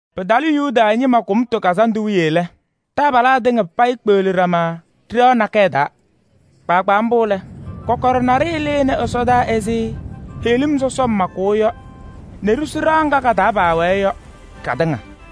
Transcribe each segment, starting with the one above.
Pɩtalɩ Yuda ñɩma Kʋmtʋ Kazandʋ wiye lɛ, taabalaa tɩŋa payɩ kpeɣli ɖama ɖɩɣa nakɛyɛ taa. Kpaagbaa mbʋ lɛ, kɔkɔɖɛ naɖɩyɛ lɩnɩ ɛsɔdaa ɛzɩ heɣlim sɔsɔm makʋʋ yɔ nɛ ɖisu ɖɩɣa ŋga ka-taa paawɛɛ yɔ katɩŋa.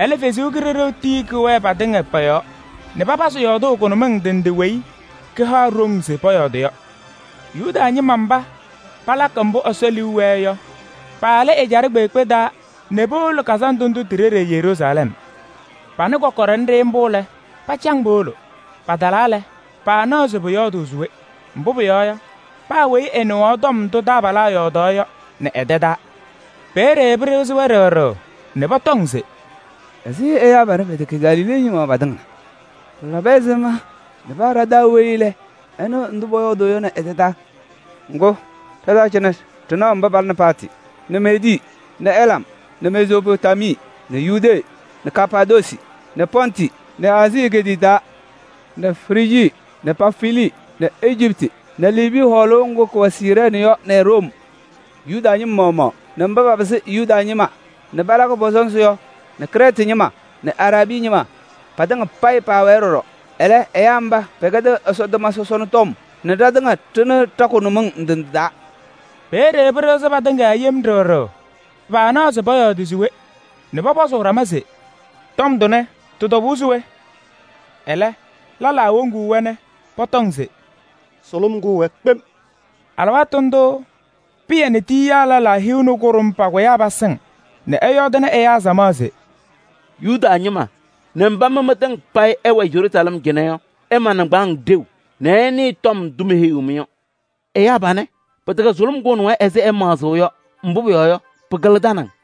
Ɛlɛ Ɛsɔ Kalɩzaɣ tii kɛwɛɛ patɩŋa pɔ-yɔɔ nɛ papazɩ yɔɔdʋʋ kʋnʋmɩŋ ndɩ ndɩ weyi kaha-wɛ ɖoŋ se pɔyɔɔdɩ yɔ. Yuda ñɩma mba palakɩ mbʋ Ɛsɔ liu wɛɛ yɔ, paalɩ ajɛɛ kpeekpe taa nɛ powolo kazandʋ ndʋ ti-ɖeɖe Yeruusalɛm. Panɩ kɔkɔɖɛ nɖɩ mbʋ lɛ, pacaŋ powolo. Patalaa lɛ, paanaɣ se pɔyɔɔdɩ se we, mbʋ pʋyɔɔ yɔ, paa weyi ɛnɩɣaɣ tɔm ndʋ taabalaa yɔɔdaɣ yɔ nɛ ɛ-tɛ taa. Peeye pɩɖɩɣzɩ-wɛ yem ɖɩɣ ɖɩɣ nɛ pɔtɔŋ se: “Ɛzɩ ɛyaa panɛ pɛtɛkɛ Galilee ñɩma patɩŋa na? Pɩlabɩ ɛzɩma nɛ paa ɖa-taa weyi ɛnɩɣ ndʋ pɔyɔɔdʋʋ yɔ nɛ ɛ-tɛ taa? Ŋgʋ, ɖa-taa cɩnɛ wɛ mba palɩnɩ Partɩ nɛ Meedii nɛ Elam nɛ Mezoopotamii nɛ Yudee nɛ Kapaadoosi nɛ Pɔntɩ nɛ Aazii egeetiye taa nɛ Frijii nɛ Pamfilii nɛ Ejiptɩ nɛ Liibii hɔɔlʋʋ ŋgʋ kʋwɛ Siirɛɛnɩ yɔ nɛ Room. Yuda ñɩma maɣmaɣ nɛ mba papɩsɩ Yuda ñɩma nɛ palakɩ pɔ-sɔnzɩ yɔ nɛ Krɛɛtɩ ñɩma nɛ Araabii ñɩma patɩŋa payɩ paawɛɛ ɖɔɖɔ. Ɛlɛ ɛyaa mba pɛkɛdɩɣ Ɛsɔ tʋma sɔsɔna tɔm nɛ ɖatɩŋa ɖɩnɩɣ ɖa-kʋnʋmɩŋ ndɩ ndɩ taa!” Peeye pɩɖɩɣzɩ patɩŋa yem ɖɩɣ ɖɩɣ, paanaɣ pɔyɔɔdɩ se we nɛ pɔpɔzʋʋ ɖama se: “Tɔm tʋnɛ, tɩ-tɔbʋʋ se we?” Ɛlɛ lɛlaa woŋuu-wɛ nɛ pɔtɔŋ se: “Sʋlʋm kʋʋ-wɛ kpem!” Alɩwaatʋ ndʋʋ Pɩyɛ nɛ tiyiyaa lɛlaa hiu nɛ kʋɖʋm pakʋyaa pasɩŋ nɛ ɛyɔɔdɩnɩ ɛyaa samaɣ se: “Yuda ñɩma nɛ mba mɩ mɩtɩŋa payɩ ɩwɛ Yeruusalɛm cɩnɛ yɔ! Ɩɖʋ nɩŋgbaaŋ ɖeu nɛ ɩnɩɩ tɔm ndʋ meheyiɣ-mɩ yɔ. Ɛyaa panɛ, pɩtɛkɛ sʋlʋm kʋʋnɩ-wɛ ɛzɩ ɩyɔɔdʋʋ yɔ, mbʋ pʋyɔɔ yɔ, pɩkɩlɩ tanaŋ.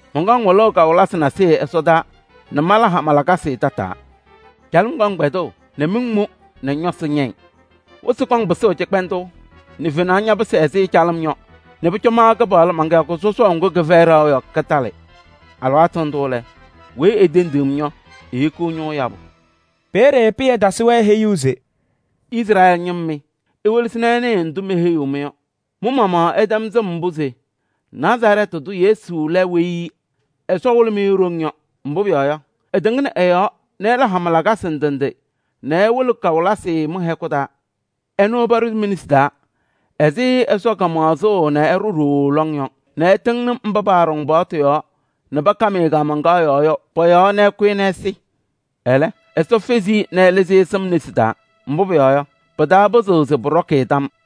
Mɔnkɔŋ wɩlʋʋ kawɩlɩsɩ nasɩyɩ ɛsɔdaa nɛ mala hama lakasɩ tataa: calɩm kɔŋ kpɛdʋʋ nɛ miŋ mʋ nɛ ñɔsɩ ñɛyɩ. Wɩsɩ kɔŋ pɩsʋʋ cɩkpɛndʋʋ nɛ fenaɣ ñɛsɛɛ ɛzɩ calɩm yɔ nɛ pʋcɔ ma Kɩpaɣlʋ man-kɩyakʋ sɔsɔʋ ŋgʋ kɩfɛyɩ ɖaɣʋ yɔ, kɩtalɩ. Alɩwaatʋ ndʋ lɛ, weyi etendiɣ-m yɔ, ehikiɣ ñʋʋ yabʋ.’” Peeye Pɩyɛ tasɩ-wɛ heyuu se: “Izrɛɛlɩ ñɩma mɩ! Iwelesi nɛ ɩnɩɩ ndʋ meheyiɣ-mɩ yɔ: mɩ-maɣmaɣ ɩtɛm sɩm mbʋ se Nazarɛɛtɩ tʋ Yesu lɛ weyi Ɛsɔ wɩlɩ-mɩ e-ɖoŋ yɔ. Mbʋ pʋyɔɔ yɔ, ɛtɩŋnɩ ɛ-yɔɔ nɛ ɛla hama lakasɩ ndɩ ndɩ nɛ ɛwɩlɩ kawɩlɩsɩ mɩ-hɛkʋ taa. Ɛnʋ paɖʋzɩ mi-nesi taa ɛzɩ Ɛsɔ kamaɣzʋʋ nɛ ɛɖʋ ɖooo lɔŋ yɔ nɛ ɩtɩŋnɩ mba paaɖɔŋ paɣtʋ yɔɔ nɛ pakam-ɩ kaamaŋkaɣ yɔɔ yɔ pɔ-yɔɔ nɛ ɩkʋ-ɩ nɛ ɛsɩ. Ɛlɛ, Ɛsɔ fezi-i nɛ ɛlɩzɩ-ɩ nɛ sɩm nesi taa. Mbʋ pʋyɔɔ yɔ, pɩtaapɩzɩɣ se pʋɖɔkɩ-ɩ tam yɔɔ.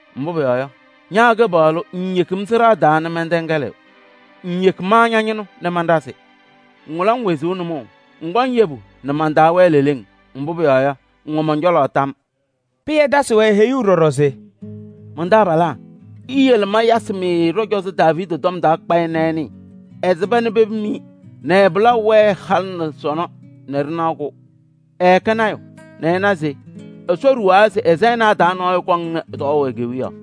Mbʋ pʋyɔɔ yɔ, ña Kɩpaɣlʋ ŋŋyeki-m sɩɖaa taa nɛ mɛntɛŋɛlɩ. Ŋŋyeki ma ña-ñɩnʋ nɛ manɖazɩ. Ŋwɩlɩ-m wezuu nʋmɔʋ, ŋkɔŋ yebu nɛ man-taa wɛɛ leleŋ. Mbʋ pʋyɔɔ yɔ, ŋwɛ mɔn-cɔlɔ tam.’” Pɩyɛ tasɩ-wɛ heyuu ɖɔɖɔ se: “Man-taabalaa! Iyele mayasɩ-mɩ ɖɔ-cɔzɔ Daaviidi tɔm kpayɩ nɛ ɩnɩɩ: ɛsɩba nɛ pepim-i nɛ ɛ-pɩlaʋ wɛɛ halɩ nɛ sɔnɔ nɛ ɖɩnaɣ-kʋ. Ɛɛkɛ lɔɔyaɣ tʋ nɛ ɛna se Ɛsɔ ɖuwaa se ɛ-sayɩnaa taa nɔɔyʋ kɔŋnɩ tɔɔʋ e-kewiyaɣ.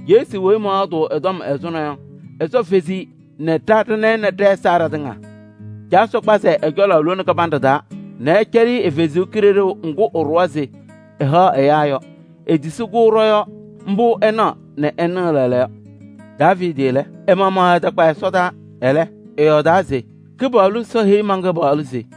Yesu weyi mɔyɔɔdʋʋ ɛ-tɔm ɛzʋnɔ yɔ, Ɛsɔ fezi-i nɛ ɖa ɖana-ɩ nɛ ɖɛ-ɛza ɖatɩŋa. Caa Ɛsɔ kpazɩ-ɩ ɛ-cɔlɔ lone kɩbanɖɛ taa nɛ ɛcɛlɩ-ɩ ɛ-Kalɩzaɣ ŋga ɛɖʋwa se ɛhaɣ ɛyaa yɔ: etisi-kɛ ɖɔ-yɔɔ. Mbʋ ɩnaɣ nɛ ɩnɩɣ lɛɛlɛɛyɔ. Daaviidi lɛ, ɛ-maɣmaɣ ɛtakpa ɛsɔdaa. Ɛlɛ, ɛyɔɔdaa se: ‘Kɩpaɣlʋ Ɛsɔ heyi man-Kɩpaɣlʋ se: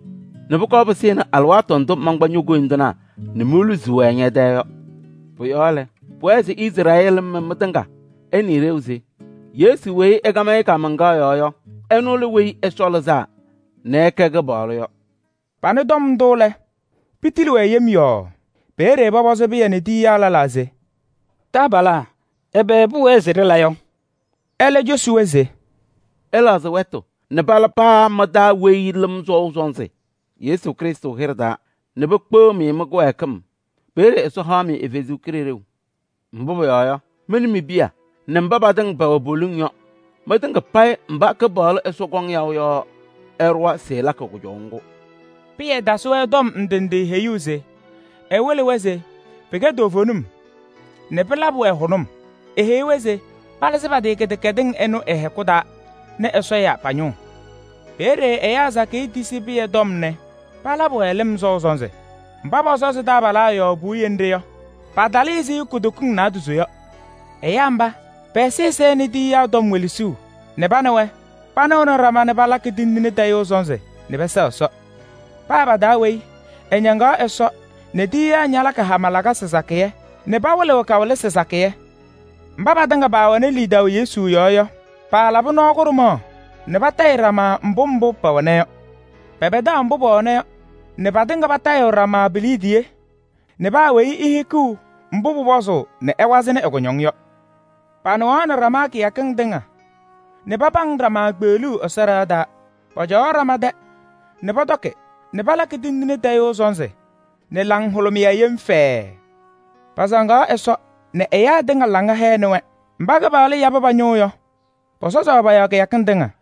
nɛ pʋkɔɔ pɩsɩnɩ alɩwaatʋ ndʋ mankpa ño-koyindinaa nɛ moluzi-wɛ ñɛ-tɛɛ yɔ.’ Pʋ-yɔɔ lɛ, pʋwɛɛ se Izrɛɛlɩ ñɩma mɩ mɩtɩŋa, ɩnɩɩ ɖeu se: Yesu weyi ɩkam-ɩ kaamaŋkaɣ yɔɔ yɔ, ɛnʋ lɛ Weyi Ɛsɔ Lɩzaa nɛ ɛkɛ Kɩpaɣlʋ yɔ!” Panɩ tɔm ndʋ lɛ, pitili-wɛ yem yɔɔɔ. Peeye pɔpɔzɩ Pɩyɛ nɛ tiyiyaa lɛlaa se: “Taabalaa! Ɛbɛ pʋwɛɛ se ɖɩla yɔ?” Ɛlɛ cosi-wɛ se: “Ɩlɛɣzɩ wɛtʋ nɛ pala paa mɩ-taa weyi lɩm sɔʋ sɔnzɩ Yesu Krɩstʋ hɩɖɛ taa nɛ pekpeɣ-mɩ mɩ-kɩwɛɛkɩm. Peeye Ɛsɔ haɣ-mɩ ɛ-Kalɩzaɣ. Mbʋ pʋyɔɔ yɔ, mɩ nɛ mi-piya nɛ mba patɩŋa pɛwɛ poliŋ yɔ: mɩtɩŋa payɩ mba Kɩpaɣlʋ Ɛsɔ kɔŋ yaʋ yɔ, ɛɖʋwa se ɛlakɩ kʋjɔʋ ŋgʋ.” Pɩyɛ tasɩ-wɛ tɔm ndɩ ndɩ heyuu se ɛwɩlɩnɩ-wɛ se pɩkɛ toovenim nɛ pɩlabɩ-wɛ hʋnʋm. Eheyi-wɛ se palɩzɩ pa-tɩ kɩdɛkɛdɩŋ ɩnʋ ɩ-hɛkʋ taa nɛ Ɛsɔ ya pa-ñʋʋ. Peeye ɛyaa sakɩyɛ tisi Pɩyɛ tɔm nɛ palabɩ-wɛ lɩm sɔʋ sɔnzɩ. Mba pɔsɔzɩ taabalaa yɔɔ puwiye nɖɩ yɔ, patalɩ ɛzɩ kutokiŋ naadozo yɔ. Ɛyaa mba, pɛ-ɛzɩyɛ sɛnɩ tiyiyaa tɔm welesuu nɛ pa nɛ wɛ panɩɣnɩ ɖama nɛ palakɩ tindine tayʋʋ sɔnzɩ nɛ pɛsɛɣ Ɛsɔ. Paa pa-taa weyi ɛñaŋaɣ Ɛsɔ nɛ tiyiyaa ñalakɩ hama lakasɩ sakɩyɛ nɛ pawɩlɩɣ kawɩlɩsɩ sakɩyɛ. Mba patɩŋa paawɛnɩ lidaʋ Yesu yɔɔ yɔ, paalabɩ nɔɔ kʋɖʋmaɣ nɛ patayɩɣ ɖama mbʋ mbʋ pɛwɛna yɔ. Pɛpɛdaɣ mbʋ paawɛna yɔ nɛ patɩŋa patayɩɣ ɖama pi-liidiye nɛ pamaɣzɩɣnɩ paa weyi ɛ-kʋñɔŋ. Panɩɣaɣnɩ ɖama kɩyakɩŋ tɩŋa nɛ papaŋ ɖama kpeɣluu Ɛsɔ ɖɩɣa taa. Pɔcɔwaɣ ɖama tɛ nɛ pɔtɔkɩ nɛ palakɩ tindine tayʋʋ sɔnzɩ nɛ laŋhʋlʋmɩyɛ yem fɛɛɛ. Pasaŋaɣ Ɛsɔ nɛ ɛyaa tɩŋa laŋa hɛɣnɩ-wɛ. Mba Kɩpaɣlʋ yabɩ pa-ñʋʋ yɔ, pɔsɔzaɣ pɔ-yɔɔ kɩyakɩŋ tɩŋa.